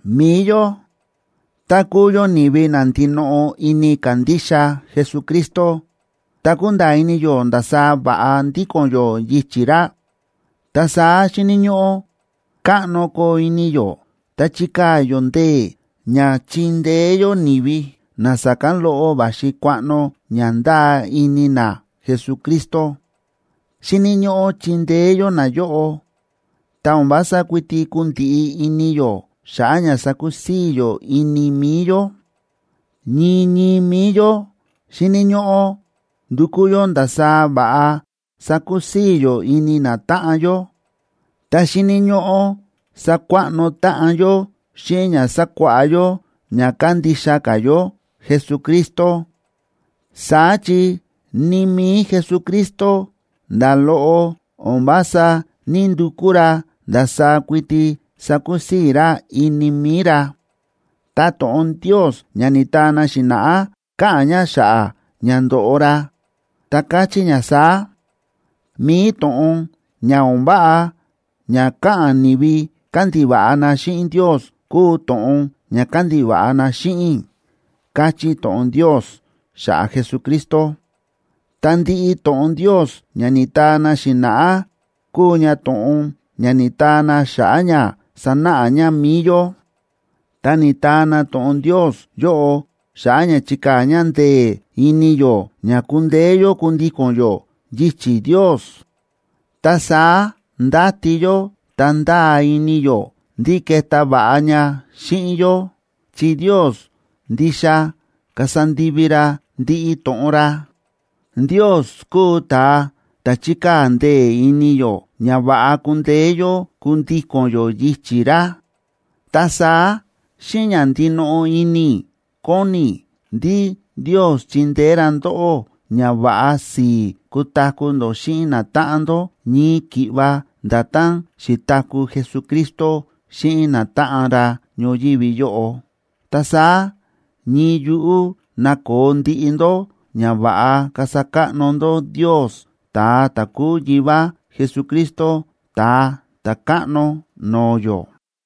Mi̱i yó, tá kúu yó ni̱vi na ndinoꞌo ini kándixa Jesucristo ta kúnda̱a̱ ini yó ndasaá va̱ꞌa ndíko̱n yó yichi̱ ra, ta saá xíni̱ ñóꞌó káꞌno koo ini yó ta chikaa̱ yó ndee̱ ña chindeé yó ni̱vi na sa̱kán loꞌo va̱xi kuaꞌno ña ndáa ini na Jesucristo. Xíni̱ ñóꞌó chindeé yó nayóꞌo, ta o̱n vása kuiti kundiꞌi ini yó xa̱ꞌa̱ ña sakusii̱ yó ini mi̱i yó. Ñii ñii mi̱i yó xíni̱ ñóꞌó ndukú yó ndasaá va̱ꞌa sakusii̱ yó ini natáꞌan yó, ta xíni̱ ñóꞌó sakuaꞌno táꞌan yó xíꞌin ña sakuáꞌá yó ña kándixa ka̱ yó Jesucristo. Saá chi ni mi̱i Jesucristo, nda̱ loꞌo o̱n vása ní‑ndukú ra ndasaá kuiti sakusii̱ ra ini mi̱i ra. Ta to̱ꞌon Ndios ña ni̱taa na xi̱na̱ꞌá, káꞌa̱n ña xa̱ꞌa̱ ña ndo̱ꞌo ra, ta káchí ña saá: “Mi̱i to̱ꞌon ña o̱n váꞌa ña káꞌa̱n ni̱vi kándiva̱ꞌa na xíꞌin Ndios kúu to̱ꞌon ña kándiva̱ꞌa na xíꞌin i̱”, káchí to̱ꞌon Ndios xa̱ꞌa̱ Jesucristo. Ta ndiꞌi to̱ꞌon Ndios ña ni̱taa na xi̱na̱ꞌá kúu ña to̱ꞌon ña ni̱taa na xa̱ꞌa̱ ña sanáꞌa ña mi̱i yó. Ta ni̱taa na to̱ꞌon Ndios yóꞌo xa̱ꞌa̱ ña chikaa̱ ña ndee̱ ini yó ña kundeé yó kundíko̱n yó yichi̱ Ndios. Ta saá ndáti yó ta ndáa ini yó ndí keta va̱ꞌa ña xíꞌin yó, chi Ndios ndixa kasa ndivi ra ndiꞌi to̱ꞌon ra. Ndios kúu ta̱a ta̱ chíkaa̱ ndee̱ ini yó ña va̱ꞌa kundeé yó kundíko̱n yó yichi̱ ra. Ta saá xíꞌin ña ndinoꞌo ini i̱ kóni i̱ ndí Ndios chindeé ra ndóꞌó ña va̱ꞌa si̱i̱ kutaku̱ ndó xíꞌin natáꞌan ndó, ñii ki̱ꞌva nda̱tán xi̱taku̱ Jesucristo xíꞌin natáꞌan ra ñoyívi yóꞌo. Ta saá ñii yuꞌú nakoo ndiꞌi ndó ña va̱ꞌa kasa káꞌno ndó Ndios, ta̱a ta̱ kúu Yivá Jesucristo, Ta̱a Ta̱káꞌno no̱o̱ yó.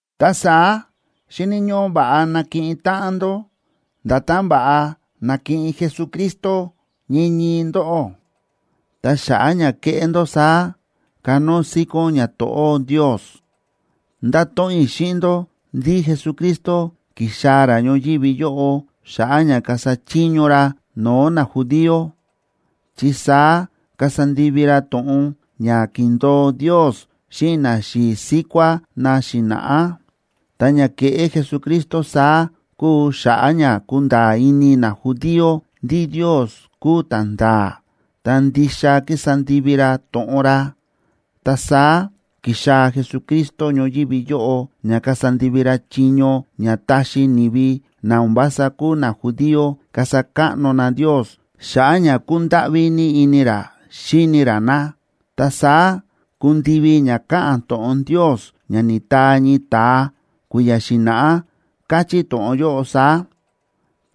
Ta saá xíni̱ ñóꞌó va̱ꞌa nakiꞌin táꞌan ndó, nda̱tán va̱ꞌa na̱kiꞌin Jesucristo ñii ñii ndóꞌó. Ta xa̱ꞌa̱ ña keꞌé ndó saá, kanóo síkón ñato̱ꞌó Ndios. Ndáto̱ꞌon i̱ xíꞌin ndó ndí Jesucristo ki̱xaa̱ ra ñoyívi yóꞌo xa̱ꞌa̱ ña kasa chiño ra no̱o̱ najudío, chi saá kasa ndivi ra to̱ꞌon ña ki̱ndo̱o Ndios xíꞌin naxi̱i̱ síkuá na xi̱na̱ꞌá. Ta ña ke̱ꞌé Jesucristo saá kúu xa̱ꞌa̱ ña kunda̱a̱ ini najudío ndí Ndios kúu ta̱nda̱a̱, ta ndixa kísa ndivi ra to̱ꞌon ra. Ta saá ki̱xaa̱ Jesucristo ñoyívi yóꞌo ña kasa ndivi ra chiño ña táxi ni̱vi na o̱n vása kúu najudío kasa káꞌno na Ndios xa̱ꞌa̱ ña kúndáꞌví ní ini ra xíni ra na. Ta saá kundivi ña káꞌa̱n to̱ꞌon Ndios ña ni̱taa ñii ta̱a kui̱ya̱ xi̱na̱ꞌá, káchí to̱ꞌon yóꞌo saá: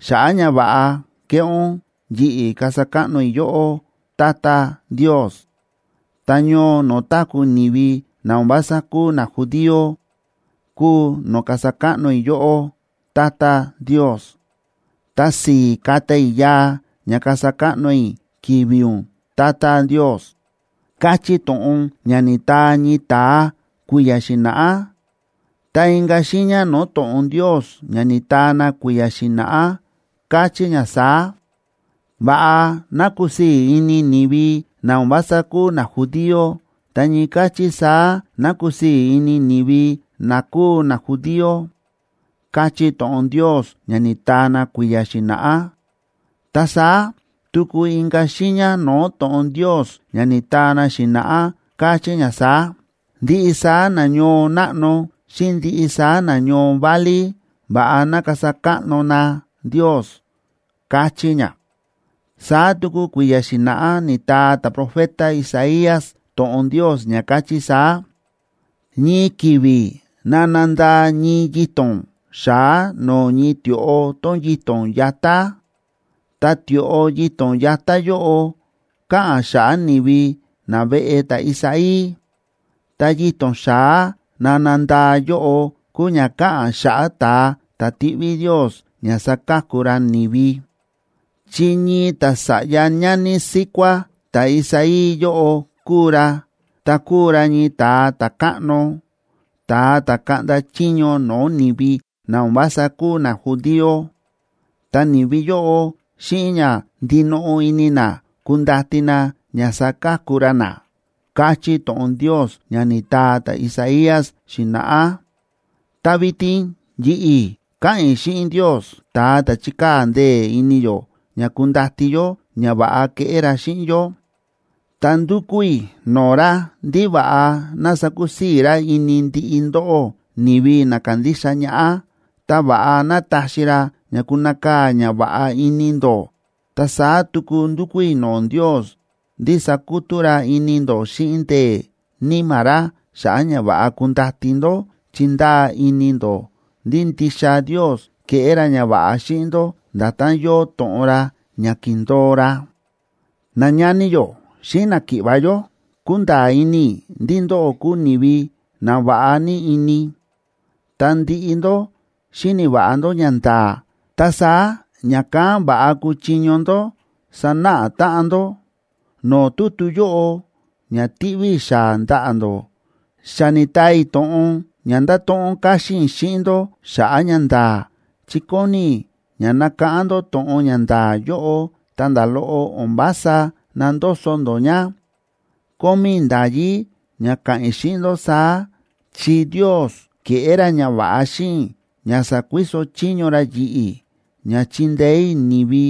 Xa̱ꞌa̱ ñava̱ꞌa kéꞌé ún, yi̱ꞌi̱ kasa káꞌno i̱ yóꞌó, Tata Ndios. Ta ñoo no̱o̱ táku̱ ni̱vi na o̱n vása kúu najudío kúu no̱o̱ kasa káꞌno i̱ yóꞌó, Tata Ndios. Ta si̱i̱ kata i̱ yaa ña kasa káꞌno i̱ ki̱vi̱ ún, Tata Ndios, káchí to̱ꞌon ña ni̱taa ñii ta̱a kui̱ya̱ xi̱na̱ꞌá. Ta inka̱ xiiña no̱o̱ to̱ꞌon Ndios ña ni̱taa na kui̱ya̱ xi̱na̱ꞌá, káchí ña saá: Va̱ꞌa ná kusii̱ ini ni̱vi na o̱n vása kúu najudío, ta ñii káchí saá ná kusii̱ ini ni̱vi na kúu najudío, káchí to̱ꞌon Ndios ña ni̱taa na kui̱ya̱ xi̱na̱ꞌá. Ta saá tuku inka̱ xiiña no̱o̱ to̱ꞌon Ndios ña ni̱taa na xi̱na̱ꞌá, káchí ña saá: ¡Ndiꞌi saá na ñoo náꞌno xíꞌin ndiꞌi saá na ñoo válí, va̱ꞌa ná kasa káꞌno na Ndios! káchí ña. Saá tuku kui̱ya̱ xi̱na̱ꞌá ni̱taa ta̱profeta Isaías to̱ꞌon Ndios ña káchí saá: Ñii ki̱vi̱ nana ndaa ñii yito̱n xa̱á no̱o̱ ñii tioꞌo tón yito̱n yatá, ta tioꞌo yito̱n yatá yóꞌo káꞌa̱n xa̱ꞌa̱ ni̱vi naveꞌe ta̱Isaí. Ta yito̱n xa̱á nana ndaa yóꞌo kúu ña káꞌa̱n xa̱ꞌa̱ ta̱a ta̱ tiꞌví Ndios ña saka̱ku ra ni̱vi; chi ñii ta̱sa̱ꞌya ñani síkuá ta̱Isaí yóꞌo kuu ra, ta kuu ra ñii ta̱a ta̱káꞌno, ta̱a ta̱ kaꞌnda chiño no̱o̱ ni̱vi na o̱n vása kúu najudío. Ta ni̱vi yóꞌo xíꞌin ña ndinoꞌo ini na kundati na ña saka̱ku ra na, káchí to̱ꞌon Ndios ña ni̱taa ta̱Isaías xi̱na̱ꞌá. Ta vitin yi̱ꞌi̱ káꞌa̱n i̱ xíꞌin Ndios, ta̱a ta̱ chíkaa̱ ndee̱ ini yó ña kundati yó ñava̱ꞌa keꞌé ra xíꞌin yó, ta ndúkú i̱ no̱o̱ ra ndí va̱ꞌa ná sakusii̱ ra ini ndiꞌi ndóꞌó, ni̱vi na kándixa ñaꞌá, ta va̱ꞌa ná taxi ra ña kunakaa̱ ñava̱ꞌa ini ndó. Ta saá tuku ndúkú i̱ no̱o̱ Ndios ndí sakutú ra ini ndó xíꞌin ndee̱ Níma̱ ra, xa̱ꞌa̱ ña va̱ꞌa kundati ndó chi ndáa ini ndó ndí ndixa Ndios keꞌé ra ñava̱ꞌa xíꞌin ndó nda̱tán yóo to̱ꞌon ra ña ki̱ndo̱o ra. Nañani yó xíꞌin náki̱ꞌva̱ yó, kúnda̱a̱ ini i̱ ndí ndóꞌó kúu ni̱vi na va̱ꞌa ní ini, ta ndiꞌi ndó xíni̱ va̱ꞌa ndó ñanda̱a̱, ta saá ña̱kán va̱ꞌa kúchiño ndó sanáꞌa táꞌan ndó. No̱o̱ tutu yóꞌo, ña tíꞌví i̱ xaa̱ ndaꞌa̱ ndó, xa ni̱taa i̱ to̱ꞌon ña ndáto̱ꞌon káxín i̱ xíꞌin ndó xa̱ꞌa̱ ñanda̱a̱, chi kóni i̱ ña nakáꞌán ndó to̱ꞌon ña nda̱a̱ yóꞌo, ta nda̱ loꞌo o̱n vása nandoso ndó ña. Kómí i̱ nda̱yí ña ka̱ꞌa̱n i̱ xíꞌin ndó saá, chi Ndios ke̱ꞌé ra ñava̱ꞌa xíꞌin i̱ ña sa̱kuiso chiño ra yi̱ꞌi̱ ña chindeé i̱ ni̱vi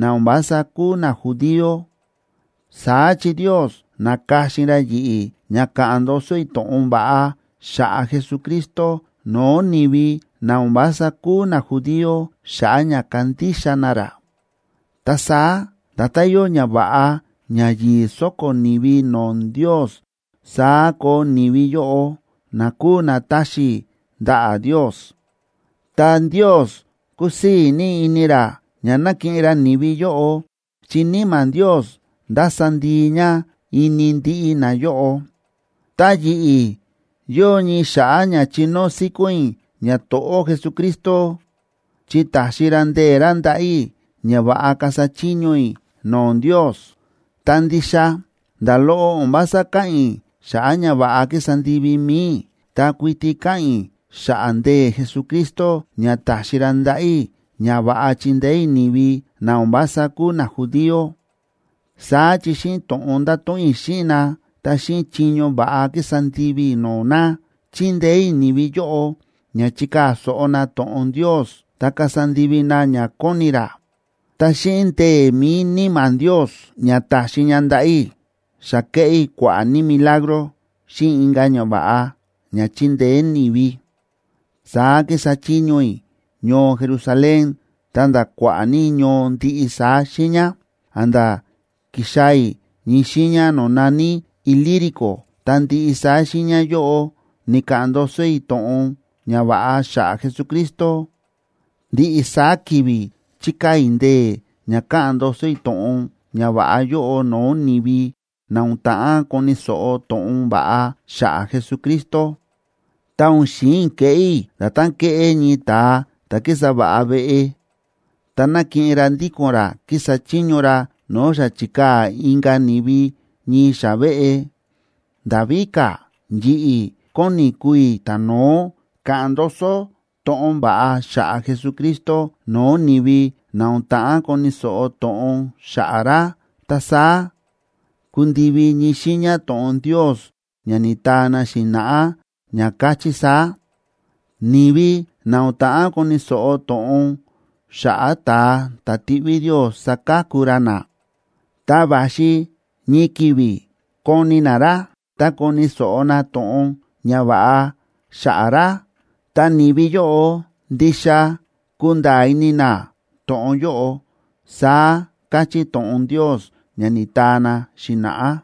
na o̱n vása kúu najudío. Saá chi Ndios na̱ka̱xin ra yi̱ꞌi̱ ña ka̱ꞌa̱n ndoso i̱ to̱ꞌon va̱ꞌa xa̱ꞌa̱ Jesucristo no̱o̱ ni̱vi na o̱n vása kúu najudío xa̱ꞌa̱ ña kandixa na ra. Ta saá nda̱tán yóo ñava̱ꞌa ña yi̱i̱ so̱ko̱ ni̱vi no̱o̱ Ndios, saá koo ni̱vi yóꞌo, na kúu na táxi i̱ ndaꞌa̱ Ndios. Ta Ndios kusii̱ ní ini ra ña nakiꞌin ra ni̱vi yóꞌo, chi Níma̱ Ndios nda̱sa ndii ña ini ndiꞌi nayóꞌo. Ta yi̱ꞌi̱, yóo ní xa̱ꞌa̱ ña chinóo síkón i̱ ñato̱ꞌó Jesucristo, chi ta̱xi ra ndee̱ ra ndaꞌa̱ i̱ ña va̱ꞌa kasa chiño i̱ no̱o̱ Ndios. Ta ndixa, nda̱ loꞌo o̱n vása káꞌa̱n i̱ xa̱ꞌa̱ ñava̱ꞌa ki̱sa ndivi mi̱i i̱, ta kuiti káꞌa̱n i̱ xa̱ꞌa̱ ndee̱ Jesucristo ña ta̱xi ra ndaꞌa̱ i̱ ña va̱ꞌa chindeé i̱ ni̱vi na o̱n vása kúu najudío. Saá chi xíꞌin to̱ꞌon nda̱to̱ꞌon i̱ xíꞌin na, ta xíꞌin chiño va̱ꞌa ki̱sa ndivi i̱ no̱o̱ na, chi̱ndeé i̱ ni̱vi yóꞌo ña chikaa̱ so̱ꞌo na to̱ꞌon Ndios ta kasa ndivi na ña kóni ra. Ta xíꞌin ndee̱ mi̱i Níma̱ Ndios ña ta̱xi ña ndaꞌa̱ i̱, xa ke̱ꞌé i̱ kua̱ꞌa̱ ní milagro xíꞌin inka̱ ñava̱ꞌa ña chi̱ndeé ni̱vi. Saá ki̱sa chiño i̱ ñoo Jerusalén ta̱nda̱ kua̱ꞌa̱ ní ñoo ndiꞌi saá xiiña, a̱nda̱ ki̱xaa̱ i̱ ñii xiiña no̱o̱ na̱ní Ilírico. Ta ndiꞌi saá xiiña yóꞌo ni̱ka̱ꞌa̱n ndoso i̱ to̱ꞌon ñava̱ꞌa xa̱ꞌa̱ Jesucristo. Ndiꞌi saá ki̱vi̱ chíkaa̱ i̱ ndee̱ ña ka̱ꞌa̱n ndoso i̱ to̱ꞌon ñava̱ꞌa yóꞌo no̱o̱ ni̱vi na o̱n ta̱ꞌán koni̱ so̱ꞌo to̱ꞌon va̱ꞌa xa̱ꞌa̱ Jesucristo. Ta o̱n xi̱in i̱ keꞌé i̱ nda̱tán kéꞌé ñii ta̱a ta̱ kísa va̱ꞌa veꞌe, ta na̱kiꞌin ra ndíko̱n ra kísa chiño ra no̱o̱ xa chi̱kaa̱ inka̱ ni̱vi ñii xa̱ꞌa̱ veꞌe. Nda̱ víka̱, yi̱ꞌi̱ kóni i̱ kuu i̱ ta̱no̱ó ka̱ꞌa̱n ndoso to̱ꞌon va̱ꞌa xa̱ꞌa̱ Jesucristo no̱o̱ ni̱vi na o̱n ta̱ꞌán koni̱ so̱ꞌo to̱ꞌon xa̱ꞌa̱ ra. Ta saá kundivi ñii xiiña to̱ꞌon Ndios ña ni̱taa na xi̱na̱ꞌá, ña káchí saá: Ni̱vi na o̱n ta̱ꞌán koni̱ so̱ꞌo to̱ꞌon xa̱ꞌa̱ ta̱a ta̱ tiꞌví Ndios saka̱ku ra na, ta va̱xi ñii ki̱vi̱ koni na ra, ta koni̱ so̱ꞌo na to̱ꞌon ñava̱ꞌa xa̱ꞌa̱ ra. Ta ni̱vi yóꞌo ndixa kunda̱a̱ ini na to̱ꞌon yóꞌo, saá káchí to̱ꞌon Ndios ña ni̱taa na xi̱na̱ꞌá.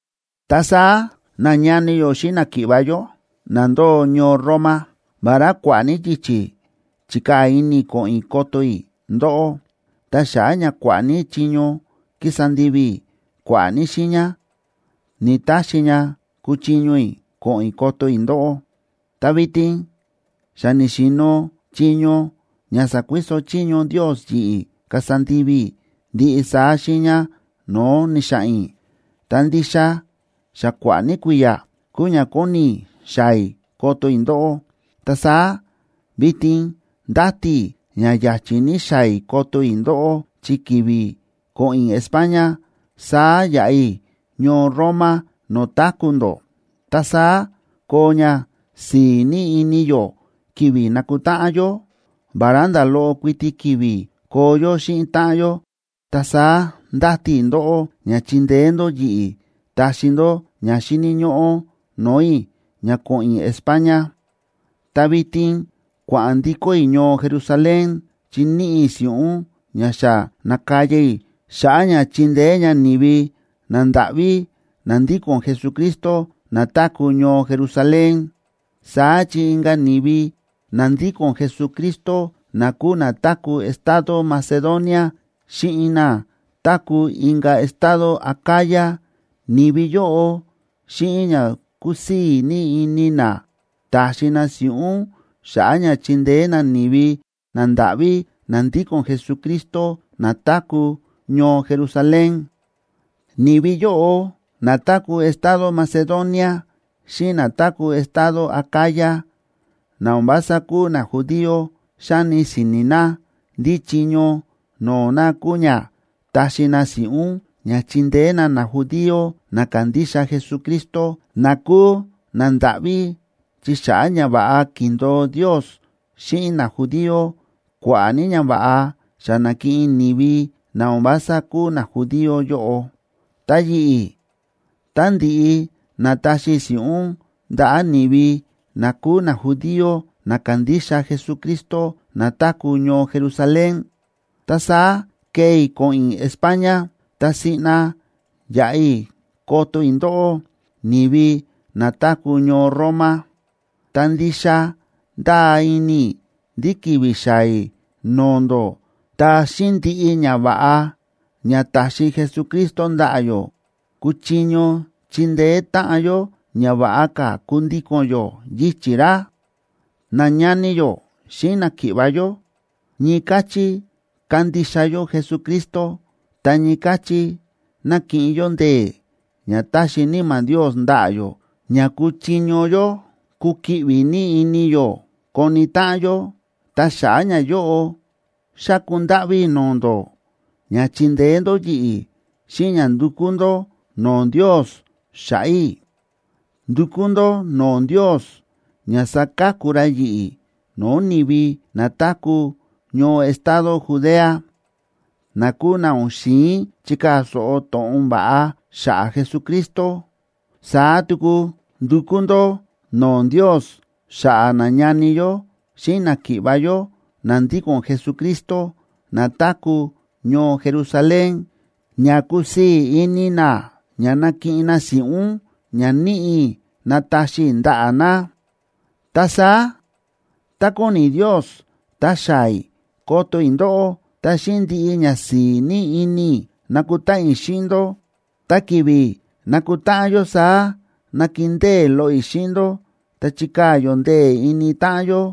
Ta saá, nañani yó xíꞌin náki̱ꞌva̱ yó na ndóo ñoo Roma, vará kua̱ꞌa̱ ní yichi̱ chi̱kaa̱ ini i̱ ko̱ꞌo̱n i̱ koto i̱ ndóꞌó, ta xa̱ꞌa̱ ña kua̱ꞌa̱ ní chiño ki̱sa ndivi i̱ kua̱ꞌa̱ ní xiiña, ni̱‑taxi ña kúchiño i̱ ko̱ꞌo̱n i̱ koto i̱ ndóꞌó. Ta vitin xa ni̱xi̱no̱ chiño ña sa̱kuiso chiño Ndios yi̱ꞌi̱ kasa ndivi i̱ ndiꞌi saá xiiña no̱o̱ ni̱xa̱ꞌa̱n i̱, ta ndixa xa kua̱ꞌa̱ ní kui̱ya̱ kúu ña kóni i̱ xaa̱ i̱ koto i̱ ndóꞌó. Ta saá vitin ndáti i̱ ña ya̱chi̱ ní xaa̱ i̱ koto i̱ ndóꞌó, chi ki̱vi̱ ko̱ꞌo̱n i̱ España, saá yaꞌa i̱ ñoo Roma no̱o̱ táku̱ ndó. Ta saá koo ñasi̱i̱ ní ini yó ki̱vi̱ nakutáꞌan yó, vará nda̱ loꞌo kuiti ki̱vi̱ koo yó xíꞌin táꞌan yó. Ta saá ndáti i̱ ndóꞌó ña chindeé ndó yi̱ꞌi̱ taxi ndó ña xíni̱ ñóꞌó no̱o̱ i̱ ña ko̱ꞌo̱n i̱ España. Ta vitin kua̱ꞌa̱n ndikó i̱ ñoo Jerusalén, chi níꞌi i̱ si̱ꞌún ña xa na̱kaya i̱ xa̱ꞌa̱ ña chindeé ña ni̱vi nandáꞌví na ndíko̱n Jesucristo na táku̱ ñoo Jerusalén. Saá chi inka̱ ni̱vi na ndíko̱n Jesucristo na kúu na táku̱ estado Macedonia xíꞌin na táku̱ inka̱ estado Acaya, ni̱vi yóꞌo xíꞌin ña kúsii̱ ní ini na, ta̱xi na si̱ꞌún xa̱ꞌa̱ ña chindeé na ni̱vi nandáꞌví na ndíko̱n Jesucristo na táku̱ ñoo Jerusalén. Ni̱vi yóꞌo na táku̱ estado Macedonia xíꞌin na táku̱ estado Acaya na o̱n vása kúu najudío xáni si̱ni̱ na ndí chiño no̱o̱ na kúu ña taxi na si̱ꞌún ña chindeé na najudío na kándixa Jesucristo, na kúu nandáꞌví, chi xa̱ꞌa̱ ñava̱ꞌa ki̱ndo̱o Ndios xíꞌin najudío, kua̱ꞌa̱ ní ñava̱ꞌa xa na̱kiꞌin ni̱vi na o̱n vása kúu najudío yóꞌo. Ta yi̱ꞌi̱, tá ndi̱ꞌi nataxi i̱ si̱ꞌún ndaꞌa̱ ni̱vi na kúu najudío na kándixa Jesucristo na táku̱ ñoo Jerusalén, ta saá kee i̱ ko̱ꞌo̱n i̱ España, ta siꞌna yaꞌa i̱ koto i̱ ndóꞌó, ni̱vi na táku̱ ñoo Roma. Ta ndixa ndáa ini i̱ ndí ki̱vi̱ xaa̱ i̱ no̱o̱ ndó, ta xíꞌin ndiꞌi ñava̱ꞌa ña ta̱xi Jesucristo ndaꞌa̱ yó, kuchiño chindeé táꞌan yó ña va̱ꞌa ka̱ kundíko̱n yó yichi̱ ra. Nañani yó xíꞌin náki̱ꞌva̱ yó, ñii káchí kándixa yó Jesucristo, ta ñii káchí na̱kiꞌin yó ndee̱ ña ta̱xi Níma̱ Ndios ndaꞌa̱ yó ña kúchiño yó kukiꞌvi ní ini yó koni táꞌan yó. Ta xa̱ꞌa̱ ñayóꞌo, xáku ndáꞌví i̱ no̱o̱ ndó ña chindeé ndó yi̱ꞌi̱ xíꞌin ña ndukú ndó no̱o̱ Ndios xa̱ꞌa̱ i̱. Ndukú ndó no̱o̱ Ndios ña saka̱ku ra yi̱ꞌi̱ no̱o̱ ni̱vi na táku̱ ñoo estado Judea, na kúu na o̱n xi̱in chikaa̱ so̱ꞌo to̱ꞌon va̱ꞌa xa̱ꞌa̱ Jesucristo. Saá tuku ndukú ndó no̱o̱ Ndios xa̱ꞌa̱ nañani yó xíꞌin náki̱ꞌva̱ yó na ndíko̱n Jesucristo na táku̱ ñoo Jerusalén, ña kusii̱ ini na ña nakiꞌin na si̱ꞌún ña níꞌi i̱ nataxi i̱ ndaꞌa̱ na. Ta saá, tá kóni Ndios, ta xaa̱ i̱ koto i̱ ndóꞌó, ta xíꞌin ndiꞌi ñasi̱i̱ ní ini i̱ nakutáꞌan i̱ xíꞌin ndó. Ta ki̱vi̱ nakutáꞌan yó saá, nakindée loꞌo i̱ xíꞌin ndó, ta chikaa̱ yó ndee̱ ini táꞌan yó.